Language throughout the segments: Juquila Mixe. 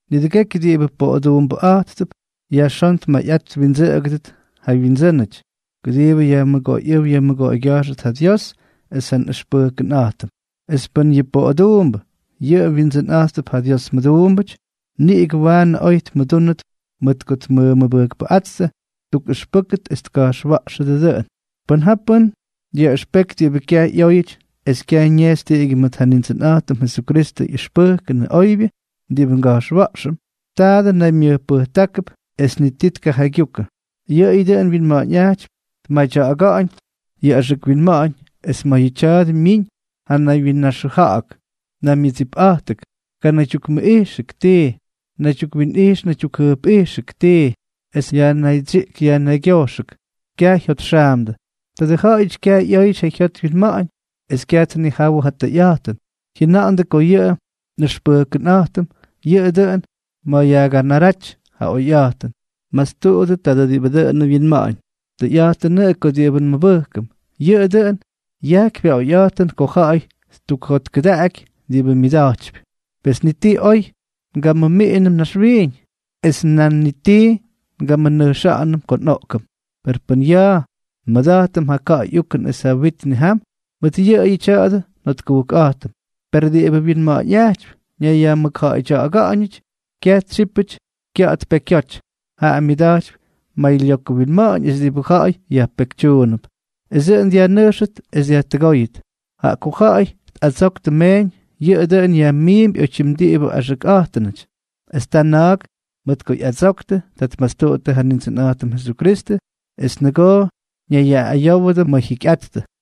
Nidʉgekyʉ diꞌibʉ poꞌoduumbʉꞌa̱jttʉp, yajxón tmayꞌat twindsʉꞌʉgʉdʉt ja wyindsʉ́nʉty, kʉdiibʉ yajmʉgoyꞌʉ́w yajmʉgoygya̱jxʉt ja Dios es ja nꞌʉxpʉjkʉnꞌa̱jtʉm. Es pʉn yʉ poꞌoduumbʉ yʉꞌʉ wyindsʉnꞌa̱jttʉp ja Dios mʉduumbʉty, niꞌigʉ waanʉ oy tmʉdúnʉt mʉt ko tmʉmʉbʉjkpʉꞌáttʉ. Tukꞌʉxpʉk es ka̱jxwa̱ꞌxʉ dʉꞌʉn. Pʉn ja pʉ́n dyaꞌʉxpeky diꞌibʉ kyaj ꞌyóyʉty es kyaj ñejxy tiꞌigyʉ mʉt ja Nindsʉnꞌa̱jtʉm Jesukristʉ ꞌyʉxpʉjkʉnʉ oybyʉ diꞌibʉ nga̱jxwa̱ꞌxʉm, taadʉ naymyʉjpʉjtákʉp es ni ti tjaygyukʉ. Yʉꞌʉyʉ dʉꞌʉn wyinma̱ꞌa̱ñꞌajtypy tmadya̱ꞌa̱ga̱ꞌa̱ñ yʉ axʉk winma̱ꞌa̱ñ. Es ma̱ yʉ tya̱a̱dʉ myiñ ja naywyinnaxʉja̱ꞌa̱k, naymyʉdsipꞌa̱jtʉk, kanaydyukmʉꞌijxʉk tii, naydyukwinꞌijx naydyukjʉjpꞌijxʉk tii, esʉ yajnaydsyiꞌk yajnaygyojxʉk, kyaj jyotxaamdʉ. Tadʉ ja̱ꞌa̱yʉty kyaj ꞌyóyʉty ja jyot wyinma̱ꞌa̱ñ es kyaj tnijawʉ ja tʉyꞌa̱jtʉn, jyʉna̱ꞌa̱ndʉ ko yʉ nꞌʉxpʉjkʉnꞌa̱jtʉm yʉꞌʉ dʉꞌʉn ma̱ yajganaraty ja oyꞌa̱jtʉn. Mastuꞌudʉ tadʉ diꞌibʉ dʉꞌʉnʉ wyinma̱ꞌa̱ñ. Tʉyꞌa̱jtʉnʉꞌʉ ko diꞌibʉ nmʉbʉjkʉm, yʉꞌʉ dʉꞌʉn yajkypy ja oyꞌa̱jtʉn ko ja̱ꞌa̱y ttukjotkʉdaꞌaky diꞌibʉ myʉda̱jtypy. Pes ni ti oj ngamʉmiꞌinʉm naxwiiñ, es nan ni ti ngamʉnʉjxa̱ꞌa̱nʉm ko nꞌoꞌkʉm. Per pʉn ya̱a̱ nmʉda̱jtʉm ja ka̱ꞌa̱y ukʉn es ja wit nijam, mʉt yʉꞌʉyʉ tya̱dʉ njotkujkꞌa̱jtʉm. Perʉ diꞌibʉ wyinma̱ꞌa̱ñꞌajtypy ñayyajmʉkja̱ꞌa̱ydya̱ꞌa̱ga̱ꞌa̱ñʉty, kyaj tsyípʉty kya̱ꞌa̱t pekyoty. Jaꞌa myʉda̱jtypy maylyokʉ winma̱ꞌa̱ñ es diꞌibʉ ja̱ꞌa̱y yajpekytyuunʉp, es dʉꞌʉn dyajnʉjxʉt es dyajtʉgóyʉt. Jaꞌa ko ja̱ꞌa̱y tꞌadsoktʉ meeñ, yʉꞌʉ dʉꞌʉn yajmiimpy oytyim diꞌibʉ axʉkꞌa̱jtʉnʉty; es ta na̱a̱k, mʉt ko ꞌyadsoktʉ, tʉ tmastuꞌuttʉ ja Nindsʉnꞌa̱jtʉm Jesukristʉ es nʉgoo ñayyaꞌꞌayówʉdʉ ma̱ jyikyꞌattʉ.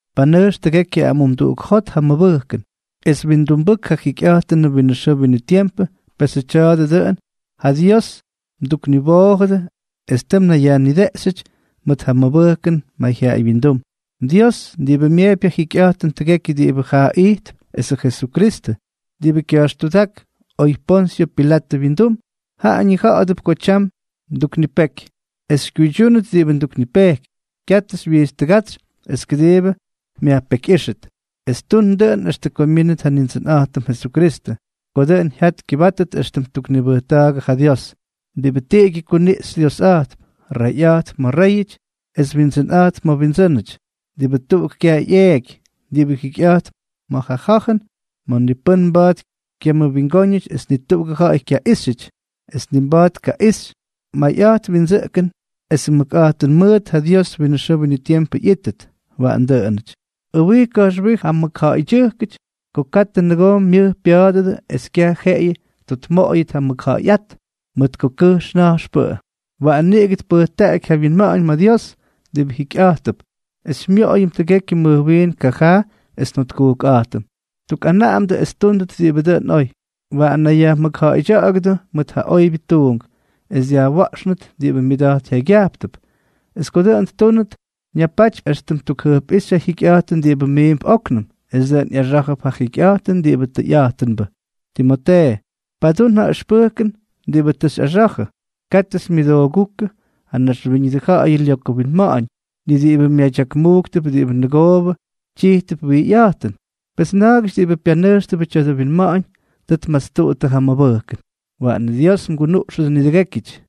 Panʉjx tʉgekyʉ amumduꞌuk jot ja mʉbʉjkʉn, es windumbʉk ja jikyꞌa̱jtʉnʉ winʉ xʉʉ winʉ tiempʉ, pesʉ tya̱a̱dʉ dʉꞌʉn ja Dios mdukniwoojʉdʉ es tʉ mnayyajnideꞌxyʉty mʉt ja mmʉbʉjkʉn mayjyaꞌaywyindúm. Dios, diꞌibʉ myeepy ja jikyꞌa̱jtʉn tʉgekyʉ diꞌibʉ jaa ijtp, esʉ Jesukristʉ, diꞌibʉ kya̱jxtudák oy Ponsyʉ Pilatʉ wyindum, jaꞌa ñija̱ꞌa̱dʉp ko tyam nduknipeky es xykyuydyúnʉt diꞌibʉ nduknipejkypy. Katʉ xywyijtstʉgátsy es kʉdiibʉ myajpekyꞌíxʉt, es tun dʉꞌʉn extʉ ko myínʉt ja Nindsʉnꞌa̱jtʉm Jesukristʉ, ko dʉꞌʉn jyat kyʉbátʉt éxtʉm ttuknibʉjtákʉ ja Dios, diꞌibʉ tiꞌigyʉ kuniꞌxy Diosꞌa̱jtp, Reyꞌa̱jtp ma̱ réyʉty es Windsʉnꞌa̱jtp ma̱ windsʉ́nʉty, diꞌibʉ tuꞌuk kyaj ꞌyeeky, diꞌibʉ jikyꞌa̱jtp ma̱ ja ja̱jʉn ma̱ ni pʉ́n mba̱a̱t kyamʉwingóñʉty, ni tuꞌugʉ ja̱ꞌa̱y kyaꞌíxyʉty, es ni mba̱a̱t tkaꞌixy. ¡Mayꞌa̱jt windsʉꞌkʉn es mʉkꞌa̱jtʉn mʉʉt ja Dios winʉ xʉʉ winʉ tiempʉ ꞌyítʉt! Waꞌan dʉꞌʉnʉty. Ʉwij ka̱jxwij ja mʉkja̱ꞌa̱ydyʉjkʉty ko katʉ nʉgoo myʉj pya̱a̱dʉdʉ es kyaj jeꞌeyʉ tjotmoꞌoyʉt ja mʉkja̱ꞌa̱yꞌát, mʉt ko kʉjx na̱jxpʉꞌʉ. Waꞌan niꞌigʉ tpʉjtaꞌaky ja wyinma̱ꞌa̱ñ ma̱ Dios, diꞌibʉ jikyꞌa̱jtp es xymyoꞌoyʉm tʉgekyʉ mʉjwiin kyajaa es njotkujkꞌa̱jtʉm. Tukꞌanaꞌamdʉ es ttúndʉt diꞌibʉ dʉꞌʉn oy. Waꞌan nayyajmʉkja̱ꞌa̱ydya̱ꞌa̱gʉdʉ mʉt ja oybyʉ tuunk, es dyajwa̱ꞌxa̱ꞌa̱nʉt diꞌibʉ myʉda̱jt jyaygyajptʉp. Es ko dʉꞌʉn ttúnʉt, ñapatypy éxtʉm ttukjʉjpꞌíxy ja jyikyꞌa̱jtʉn diꞌibʉ miimp óknʉm, es dʉꞌʉn ꞌyaxá̱jʉp ja jikyꞌa̱jtʉn diꞌibʉ tʉyꞌa̱jtʉnbʉ. Timotee, padún ja ʉxpʉjkʉn diꞌibʉ tʉ xyꞌaxa̱jʉ. Katʉ xymyʉdoogúkʉ yʉ naxwíñʉdʉ ja̱ꞌa̱yʉ lyokʉ winma̱ꞌa̱ñ, ni diꞌibʉ myadyakmujktʉp diꞌibʉ nʉgoobʉ tyijtʉp wijyꞌa̱jtʉn. Pes na̱a̱gʉty diꞌibʉ pyanʉjxtʉbʉ tya̱dʉ winma̱ꞌa̱ñ, tʉ tmastuꞌuttʉ ja mʉbʉjkʉn. Waꞌan Dios mgunuꞌxʉdʉ nidʉgékyʉty.